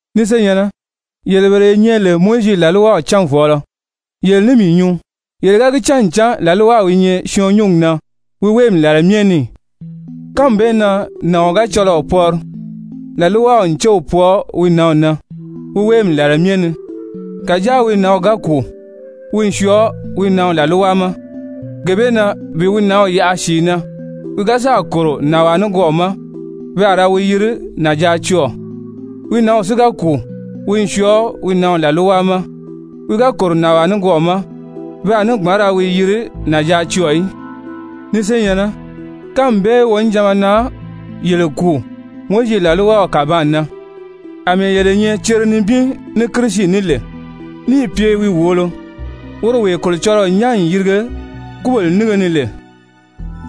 Ni senyɛ̀nnɛ, yele bele ye nyɛ lè Mowizi làlwaw cánvɔɔlɔ, yele ní mii nyuu, yele ga gi cán ncan làlwaw i nyɛ syɔɔn nyúngi na wi wéemi làla myɛ ni ì? Kánmi bee na nàɔn ga cɔlɔɔ pɔri, làlwaw n céw pwɔɔ wi nǎnw na wi wéemi làla myɛ ni. Kàjáa wi nǎnw ga kùu, wi n syɔɔ wi nǎnw làlwa ma. Gee bee na bi wi nǎnw yaʔa sìi na, wi ga sáà kòro nànwaa nikwɔɔ ma, pe a ra wi yiri nànjaacɔɔ̀, wi nǎnw si ga kùu, wi n syɔɔ wi nǎnw làlwa ma, wi ga kòro nànwaa nikwɔɔ ma, pe a ní gbǎn ra wi yiri nànjaacɔɔ̀ í. Ni senyɛ̀nnɛ, kánmi bee wonijanma na yele kùu Mowizi làlwaw kàbaan na àmɛɛ yele nyɛ cere nibin ní Kirisi ní lè, níì pye wi wòolo woro wee Kolocɔlɔɔ nyán n yirige kúbèle nínge ni lè,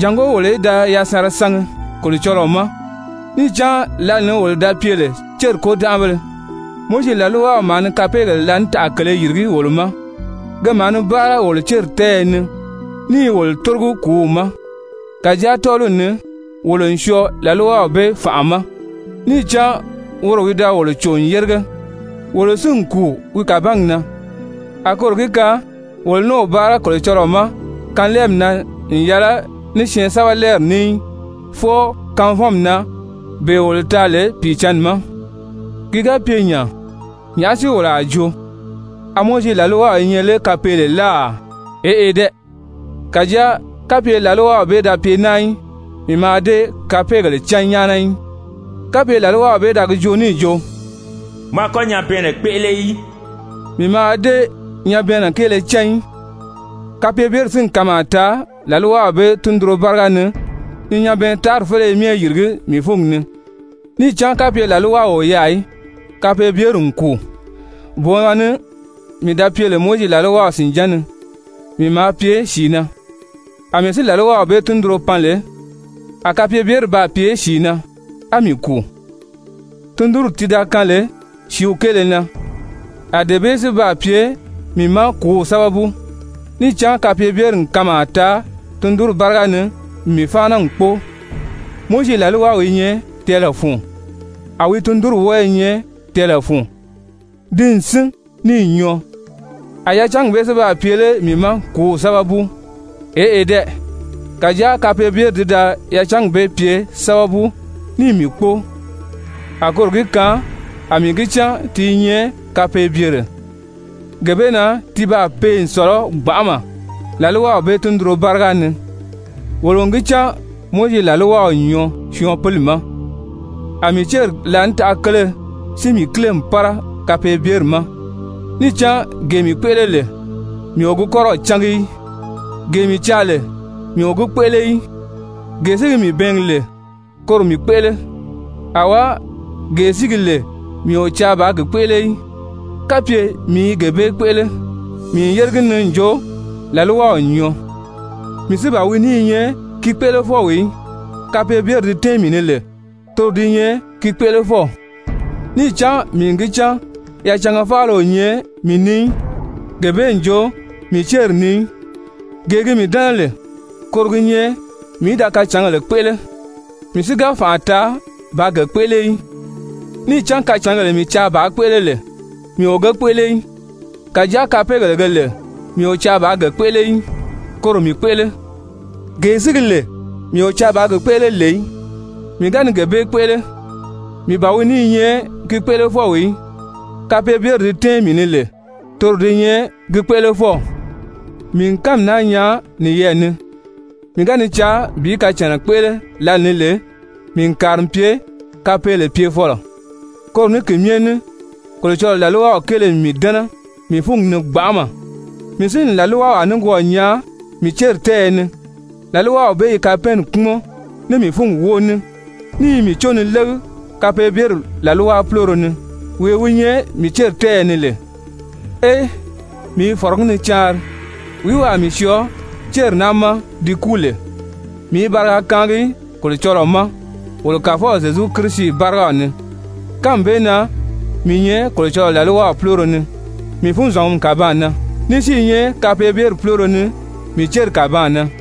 jàngó wolo í da yasanra sangi Kolocɔlɔɔ ma. Níì cán lǎli ni wolo da pye lè céri kôdanʔabéle, Mowizi làlwaw maa ni kapeegèle láanitaʔa kele yìrigí wolo ma, ke maa ni báara wolo céri tɛ́ɛyɛ ni ní i wolo tórogi kùúw ma. Kàjáa tɔ́ɔliw ni wolo n syɔɔ làlwaw bee fànʔa ma, níì cán woro wi da wolo cò n yérige, wolo si n kùu wi kàbangi na, a koro gi kaan wolo ní o báara Kolocɔlɔɔ ma kanlɛɛmi na n yɛlɛ ní syɛɛnsɛbɛlɛɛri ní í, fwɔɔ kanvɔnmi na, bee wolo taa lè Pìicǎnni ma. Ki ga pye nya, nyàʔá si wolo a joo? A Mowizi làlwaw i nyɛ lé kapeele láà? Eʔe dɛ! Kàjáa kapye làlwaw bee da pye naa í, mii mǎà dée kapeegèle cán nyáana í. Kapye làlwaw bee da gi joo níì jo: «Mɔ a kɔ́ nyabɛɛnnɛ kpéʔele í,» mii mǎà dée nyabɛɛnnɛ kéele cán í. Kapeebyeri si n kanmaa taa làlwaw bee tundunro báriga ni ni nyabɛɛntaari féleye myɛ yìrigí mii fúngi ni. Níì cán kapye làlwaw o yaà í, kapeebyeri n kùu. Booma ni mii da pye lè Mowizi làlwaw sìnján ni, mii maa pye sìi na. Amɛɛ si làlwaw bee tundunro pan lè, a kapeebyeri baa pye sìi na, á mii kùu. Tundunri ti da kaan lè sìíw kéele na, a dee bee si baa pye mii ma kùúw sábabu. Níì cán kapeebyeri n kanmaa taa tundunri báriga ni n mii fáana n kpóo. Mowizi làlwaw i nyɛ tɛɛlɛ fun, a wi tundunri wɔ́ɔ i nyɛ tɛɛlɛ fun, ti n sín níì nyɔɔ. A yacangi bee si baa pye lé mii ma kùúw sábabu? Eʔe dɛ! Kàjáa kapeebyeri ti da yacangi bee pye sábabu níì mii kpóo, a koro gi kaan a mii gi cán ti i nyɛ kapeebyere, gee bee na ti baa pee n sɔ̀lɔ gbanʔama làlwaw bee tundunro báriga ni. Wolo n gi cán Mowizi làlwaw n nyɔɔ syɔɔn pili ma. A mii céri láanitaʔa kele si mii kíle n pára kapeebyeri ma. Níì cán gee mii kpéʔele lè, mii o gi kɔ́rɔw cángi í. Gee mii caa lè, mii o gi kpéʔele í, gee si gi mii bɛɛngi lè, koro mii kpéʔele. Awá, gee si gi lè mii o caa bàā gi kpéʔele í, kapye mii i gee bee kpéʔele, mii n yére gi ni n jo làlwaw n nyɔɔ. Mii si ban wi ní i nyɛ ki kpéʔelefɔw í, kapeebyeri di tɛ́ɛn mii ni lè, toro di nyɛ ki kpéʔelefɔw. Níì cán mii n gi cán yacanga faala o nyɛ mii ni í, gee bee n jo mii céri ni í. Gee gi mii dɛ́nɛ lè koro gi nyɛ mii í da kacǎngèle kpéʔele, mii si ga fànʔa taa bàā ge kpéʔele í. Níì cán kacǎngèle mii caa bàā kpéʔele lè, mii o ge kpéʔele í, kàjáa kapeegèle ge lè mii o caa bàā ge kpéʔele í, koro mii kpéʔele. Gee si gi lè mii o caa bàā gi kpéʔele lè í, mii ga ni gee bee kpéʔele, mii ban wi ní i nyɛ ki kpéʔelefɔw í, kapeebyeri di tɛ́ɛn mii ni lè, toro di nyɛ ki kpéʔelefɔw. Mii n kánmi naa nyaa niyɛɛ ni, mii ga ni caa bi kacànna kpéʔele lǎlee ni lè, mii n kàri n pye kapeele pyefɔlɔ. Koro ní ki myɛ ní Kolocɔlɔɔ làlwaw kéele n mii dɛ́nɛ mii fúngi ni gbanʔama. Mii si n làlwawaa nikwɔɔ nyaa mii céri tɛ́ɛyɛ ni, làlwaw bee i kapɛɛnni kpúmɔn ní mii fúngi wóo ní, ní i mii có ni légi kapeebyeri làlwa púloro ni, wee wi nyɛ mii céri tɛ́ɛyɛ ni lè. Ee, mii i fɔ̀rɔgí ni caanri! Wìí wi a mii syɔɔ céri naa ma ti kúu lè? Mii i bariga kaangi Kolocɔlɔɔ ma wolo Kàfɔw Zyezu Kirisi bárigaw ni. Kánmi bee na mii nyɛ Kolocɔlɔɔ làlwaw púloro ni mii funzɔngumi kàbaan na, ní si i nyɛ kapeebyeri púloro ni mii céri kàbaan na.